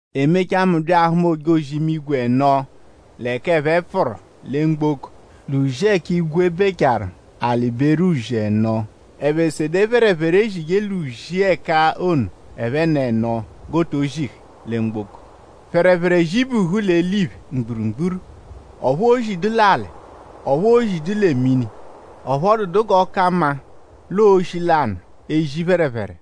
E mechaa; mu bya ahụma ojozi ẹno l'ẹka ẹphe pfụru lẹ mgboko l'uzi ẹka igwe bechaaru; alị beru uzi ẹno. Ẹphe sede phẹrephere, eshije l'uzi ẹka ono ẹphen'ẹno g'o to zihẹ lẹ mgboko. Phẹrephere zibuhu l'eliphe mgburugburu; ọphu oozidu l'alị; ọphu oozidu lẹ mini; ọphu ọ dụdu g'ọ ka mma l'ọo oshi lanụ ezi phẹrephere.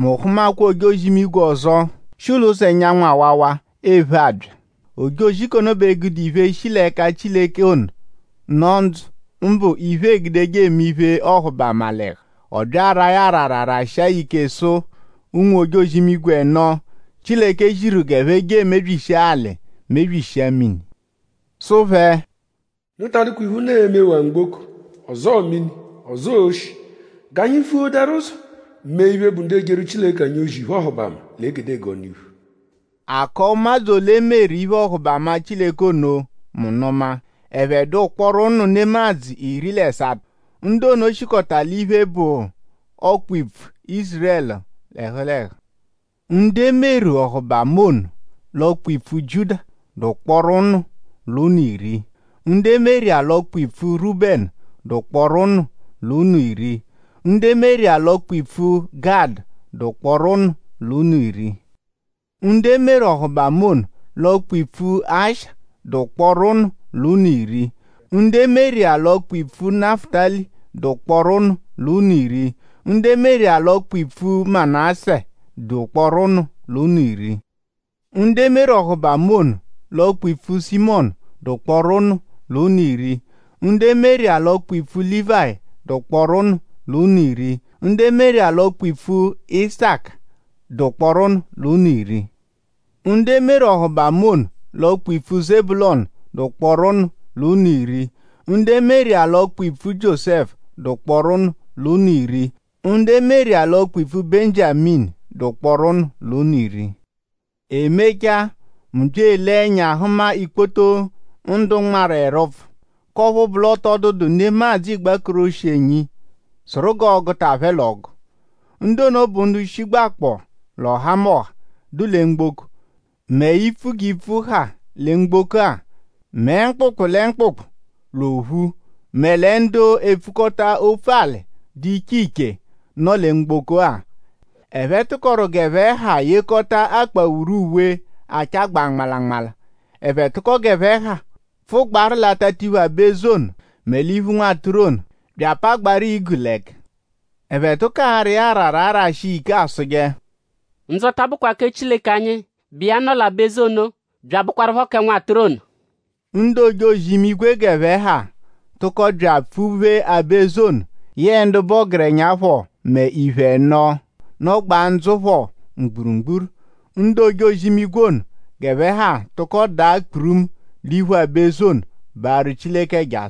Mu hụmakwa ojozi-imigwe ọzo, shi l'ụzo ẹnyanwu awawa ephe abya. Ojozi k'ono bẹ gude iphe, shi l'ẹka Chileke ono, nọ ndzụ; mbụ iphe eegudeje eme iphe-ọhubama l'ẹhu. Ọ bya araa ya arara rashịa ya ike sụ ụnwu-ojozi-imigwe ẹno, Chileke ziru g'ẹphe je emebyishia alị; mebyishia mini; sụ phẹ: “Unu ta adụkwa iphe, unu e-mewaa mgboko; ọzoo mini; ọzoo oshi; g'anyi vuadaru ụzo mee iphe, bụ ndu ejeru Chileke anyi ozi iphe-ọhubama l'egedegee ọnu-iphu.” A kọo ụmadzu ole, e meru iphe-ọhubama Chileke ono mu nụma; ẹphe dụ ụkporo ụnu nemadzụ iri l'ẹsato. Ndu ono shikọta l'iphe, bụ ọkpa-ipfu Ízurẹlu l'ẹhu l'ẹhu. Ndu e meru ọhubama ono l'ọkpa-ipfu Jiuda dụ ụkporo ụnu l'ụnu iri; ndu e meru iya l'ọkpa-ipfu Rúbẹnu dụ ụkporo ụnu l'ụnu iri; ndu e meru iya l'ọkpa-ipfu Gadụ dụ ụkporo ụnu l'ụnu iri. Ndu e meru ọhubama ono l'ọkpa-ipfu Asha dụ ụkporo ụnu l'ụnu iri; ndu e meru iya l'ọkpa-ipfu Nafụtali dụ ụkporo ụnu l'ụnu iri; ndu e meru iya l'ọkpa-ipfu Manásẹ dụ ụkporo ụnu l'ụnu iri. Ndu e meru ọhubama ono l'ọkpa-ipfu Simiyọnu dụ ụkporo ụnu l'ụnu iri; ndu e meru iya l'ọkpa-ipfu Lívayi dụ ụkporo ụnu l'ụnu iri; ndu e meru iya l'ọkpa-ipfu Isaka dụ ụkporo ụnu l'ụnu iri. Ndu e meru ọhubama ono l'ọkpa-ipfu Zebulọnu dụ ụkporo ụnu l'ụnu iri; ndu e meru iya l'ọkpa-ipfu Jiósẹfu dụ ụkporo ụnu l'ụnu iri; ndu e meru iya l'ọkpa-ipfu Benjiaminu dụ ụkporo ụnu l'ụnu iri. “E mechaa mu bya elee ẹnya hụma ikpoto ndu nmarụ ẹrupfu; k'ọphu bụ l'ọ tọ dụdu nemadzụ igbakoroshienyi sụru g'ọoguta phẹ l'ọgu. Ndu ono bụ ndu shigbakpọo l'ọhamoha, dụ lẹ mgboko; mẹ ipfu g'ipfu ha lẹ mgboko-a; mẹ mkpụkpu lẹ mkpụkpu l'ophu; mẹ lẹ ndu epfukọta opfu-alị ndu dụ iche iche, nọ lẹ mgboko-a. Ẹphe tụkoru g'ẹphe ha yekọta akpawuru uwe, achagbaa nmalanmala. Ẹphe tụko g'ẹphe ha pfụgbaaru l'atatiphu aba-eze ono; mẹ l'iphu Nwatụru ono; bya apagbaaru igu l'ẹka. Ẹphe tụko ara iya arara arashi iya ike asụje: Ndzọta bụkwa kẹ Chileke anyi, bụ iya nọ l'aba-eze ono; bya abụkwarupho kẹ Nwatụru ono.” Ndu ojozi-imigwe g'ẹphe ha tụko bya apfụ-phee aba-eze ono; yẹe ndu bụ ọgerenya phọ mẹ iphe ẹno, nọgbaa ndzụ phọ mgburugburu. Ndu ojozi-imigwe ono g'ẹphe ha tụko daa kpurumu l'iphu aba-eze ono baarụ Chileke ẹja;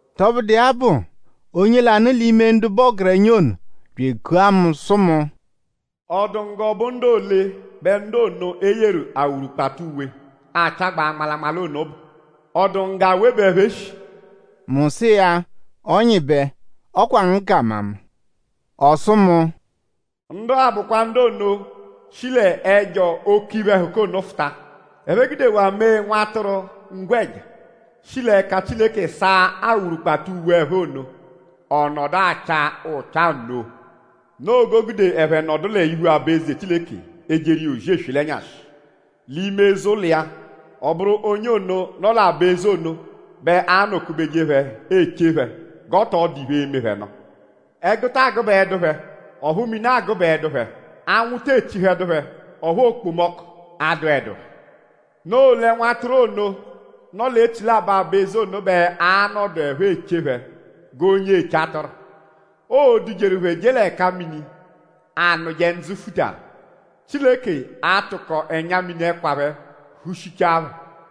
Tọbudu iya bụ; onye lanụ l'ime ndu bụ ọgerenya ono bya ekua mu sụ mu: “?Ọ dụ ngu g'ọ bụ ndu ole bẹ ndu ono, e yeru awurukpata uwe, achagbaa nmalanmala ono bụ??Ọ dụ ngu g'awe bẹ ẹphe shi?” Mu sụ iya: “Ọnyibe; ọ kwa ngu ka amama.” Ọ sụ mu: “Ndu-a bụkwa ndu ono, shi l'ẹjo oke iphe-ẹhuka ono fụta. Ẹphe gudewaa mee Nwatụru ngwẹja, shi l'ẹka Chileke saa awurukpata uwe phẹ ono; ọ nọdu acha ụcha nno. Noo g'o gude ẹphe nọdu l'iphu aba-eze Chileke ejeru iya ozi eswe l'ẹnyashi l'ime eze-ụlo iya. Ọ bụru onye ono, nọ l'aba-eze ono bẹ anọ-kubeje phẹ eche phẹ g'ọ tọ dụ iphe, e-me phẹ nụ. Ẹgu taa gụbaedu phẹ; ọphu mini agụbaedu phẹ. Anwụ te echihẹdu phẹ; ọphu okpomọku adụedu phẹ. Noo lẹ Nwatụru ono, nọ l'echilabọ aba-eze ono bẹ a-nọduepho eche phẹ g'onye eche atụru. Oo-dujeru phẹ je l'ẹka mini, anụje ndzụ futaru. Chileke a-tụko ẹnya-mini ẹkwa phẹ hushichaa phẹ.”